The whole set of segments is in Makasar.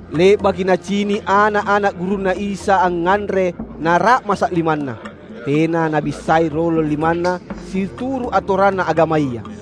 Le’baki nacini’ ana’-ana’ gurunNa Isa angnganre nara’masa’ limanna. Tena nabissai rolong limanna, situru’ atoranna agamaya.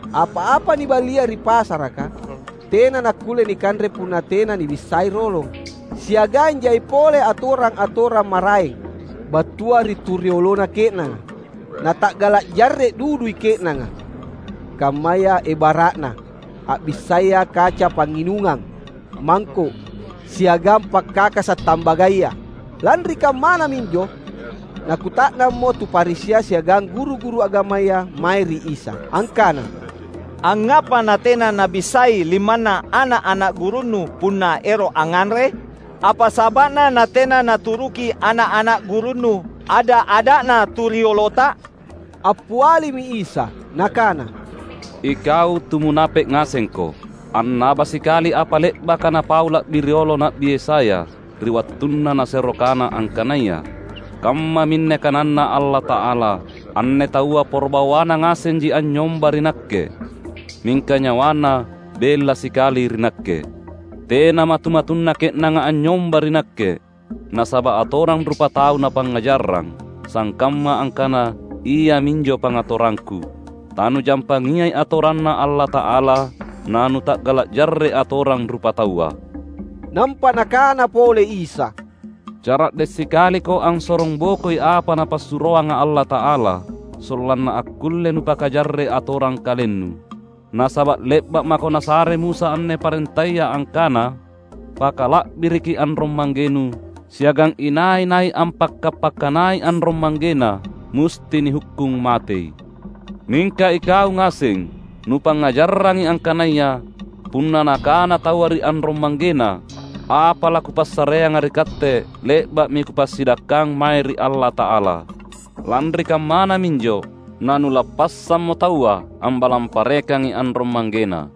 Apa-apa niballia ri pasaraka tena nakkulle nikanre punna tena nibissai rolong. Siagang jai pole atorang-atorang maraeng, battua ri tu riolona ke’nanga, nata’gala’ jarre’ dudui ke’nanga; kammaya ebara’na: a’bissaya kaca pangnginungang, mangko’, siagang pakkakasa’ tambagaya. Lanri kammana minjo nakkuta’nammo tu Farisia siagang guru-guru agamaya mae ri Isa, angkana, "Angngapa natena nabissai limanna ana’-ana’ gurunNu punna ero’ angnganre? Apa saba’na natena naturuki ana’-ana’ gurunNu ada’-ada’na tu riolota?" Appialimi Isa Nakana, "Ikau tu munape’ ngasengko! Annaba sikali apa le’baka napau la’bi riolo Na’bi Yesaya ri wattunna nasero kana angkanaya, ‘Kammaminne kananNa Allata’ala, Anne taua poro bawana ngasenji anynyomba ri Nakke, mingka nyawana bella sikali ri Nakke. Tena matu-matunna ke’nanga anynyomba ri Nakke, Nasaba’ atorang rupatau napangngajarrang sangkamma angkana iaminjo pangatorangKu!’ Tanujampangiai atoranNa Allata’ala, na nuta’gala’ jarre’ atorang rupataua." Nampa Nakana pole Isa, "Cara’de’ sikaliko ansorongbokoi apa Napassuroanga Allata’ala, sollanna akkulle nupakajarre’ atorang kalennu. Nasaba’ le’ba’ mako nasare Musa anne parentaya angkana, ‘Pakala’biriki anrong-manggenu,’ siagang ‘Inai-nai ampakka’-pakkanai anrong-manggena musti nihukkung matei.’ Mingka ikau ngaseng nupangngajarrangi angkanaya: Punna nakana taua ri anrong-manggena, ‘Apa lakupassareanga ri katte le’ba’mi kupassidakkang mae ri Allata’ala,’ lanri kammana minjo na nulappassammo taua ambalang parekangi anrong-manggena.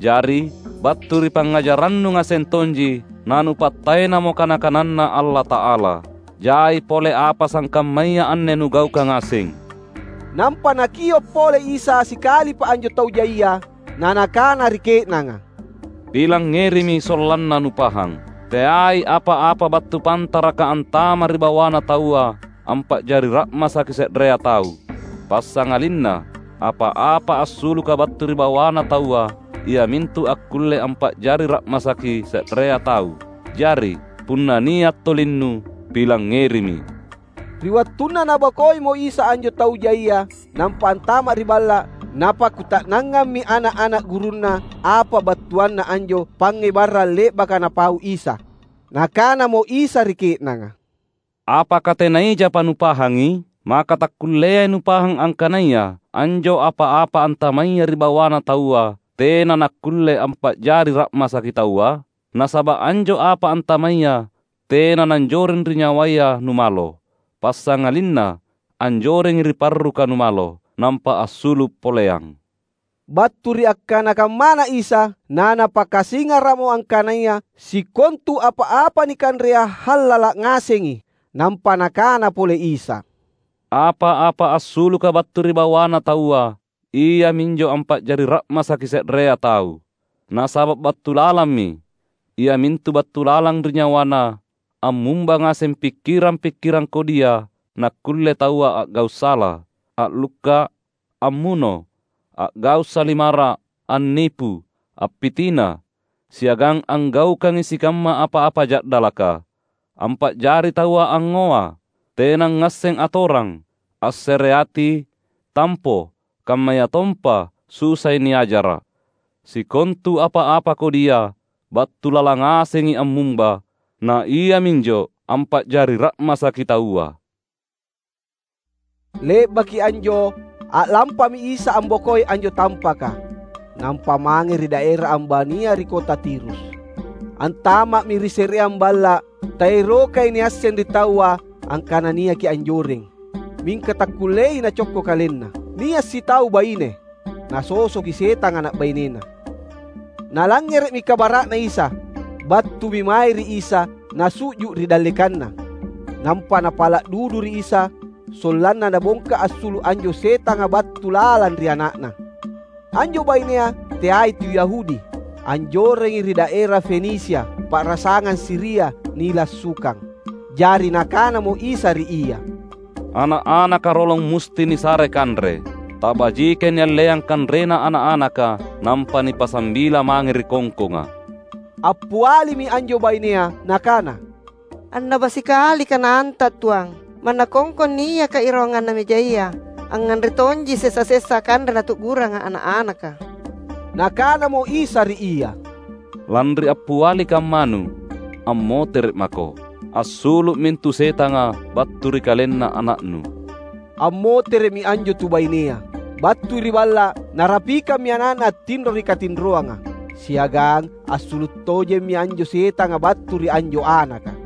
Jari, battu ri pangngajarrannu ngaseng tonji, na nupattaenamo kana-kananNa Allata’ala. Jai pole apa sangkammaya anne nugaukang ngaseng." Nampa Nakio’ pole Isa sikalipa anjo tau jaia, na Nakana ri ke’nanga, "Pilangngerimi sollanna nupahang! Teai apa-apa battu pantaraka antama’ ri bawana taua ampa’jari ra’masaki se’rea tau. Passangalinna apa-apa assuluka battu ri bawana taua iamintu akkulle ampa’jari ra’masaki se’rea tau. [Jari, punna nia' tolinnu, pilangngerimi.]" Ri wattunna Nabokoimo Isa anjo tau jaia nampa antama’ ri balla’, napakkuta’nangammi ana’-ana’ gurunNa apa battuanna anjo pangngebarang le’baka Napau Isa. Nakanamo Isa ri ke’nanga, "Apaka tena ijapa nupahangi? Maka takkulleai nupahang angkanaya anjo apa-apa antamaya ri bawana taua tena nakkulle ampa’jari ra’masaki taua? Nasaba’ anjo apa antamaya tena nanjoreng ri nyawaya numalo; passangalinna anjorengi ri parruka numalo, nampa assulu’ poleang." Battu ri akkana kammana Isa, naNapakasingara’mo angkanaya sikontu apa-apa nikanrea hallala’ ngasengi. Nampa Nakana pole Isa, "Apa-apa assuluka battu ri bawana taua, iaminjo ampa’jari ra’masaki se’rea tau. Nasaba’ battu lalammi, iamintu battu lalang ri nyawana, ammumba ngaseng pikkirang-pikkirang kodia nakkulle taua a’gau’ sala, a’lukka’, ammuno, a’gau’ salimara’, annipu, appitina, siagang anggaukangi sikamma apa-apa ja’dalaka, ampa’jari taua angngoa, tenangngasseng atorang, assereati, tampo, kammayatompa susai niajara’. Sikontu apa-apa kodia, battu lalang ngasengi ammumba, na iaminjo ampa’jari ra’masaki taua." Le’baki anjo a’lampami Isa ambokoi anjo tampaka nampa mange ri daera ambania ri kota Tirus. Antama’mi ri se’reang balla’. Taerokai niasseng ri taua angkana niaki anjoreng. Mingka takkulleai Nacokko KalenNa. Nia’ sitau baine, nasosoki setang ana’ bainena. Nalangngere’mi kabara’na Isa. Battumi mae ri Isa nassu’ju’ ri dallekanNa. Nampa napala’ dudu ri Isa sollanna Nabongka assulu’ anjo setanga battu lalang ri ana’na. Anjo bainea teai tu Yahudi. Anjorengi ri daera Fenisia, pa’rasangang Siria, nilassukang. Jari Nakanamo Isa ri ia, "Ana’-anaka rolong musti nisare kanre. Tabajikai nialleang kanrena ana’-anaka nampa nipasambila mange ri kongkonga." Appialimi anjo bainea nakana, "Annaba sikali kananTa, Tuang; manna kongkong niaka irawanganna mejaya, angnganre tonji sesa-sesa kanre natu’guranga ana’-anaka!" Nakanamo Isa ri ia, "Lanri appiali kammanu, ammotere’ mako; assulu’ mintu setanga battu ri kalenna ana’nu!" Ammotere’mi anjo tu bainea. Battui ri balla’, narapikammi ana’na attinro ri katinroanga, siagang assulu’ tojemmi anjo setanga battu ri anjo anaka.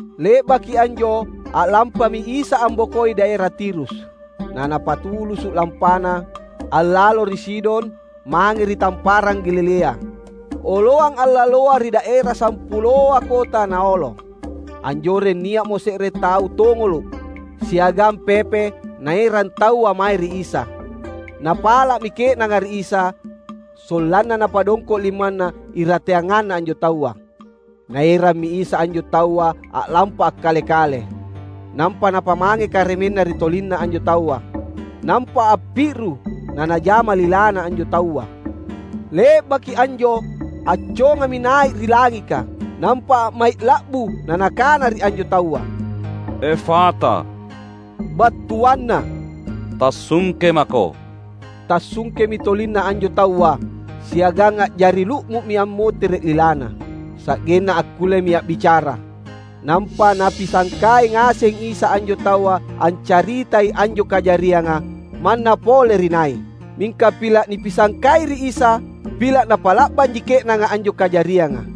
Le’baki anjo a’lampami Isa ambokoi daera Tirus, na Napatulusu’ lampaNa, allalo ri Sidon mange ri Tamparang Galilea. Oloang allaloa ri daera Sampuloa Kota Naolo. Anjoreng nia’mo se’re tau tongolo’ siagang pepe naerang taua mae ri Isa. Napala’mi ke’nanga ri Isa, sollanna Napadongko’ limanNa irateanganna anjo taua. Naerammi Isa anjo taua a’lampa akkale-kale, nampa Napamange karemenNa ri tolinna anjo taua. Nampa appi’ru na Najama lilana anjo taua. Le’baki anjo accongami nai’ ri langika, nampa a’mai’ la’bu na Nakana ri anjo taua, "Efata," battuanna, "Tassungke mako!" Tassungkemi tolinna anjo taua, siagang a’jari lu’mu’mi ammotere’ lilana, sa’genna akkullemi a’bicara. Nampa Napisangkai ngaseng Isa anjo taua ancaritai anjo kajarianga manna pole ri nai. Mingka pila’ nipisangkai ri Isa, pila’ napa’la’banji ke’nanga anjo kajarianga.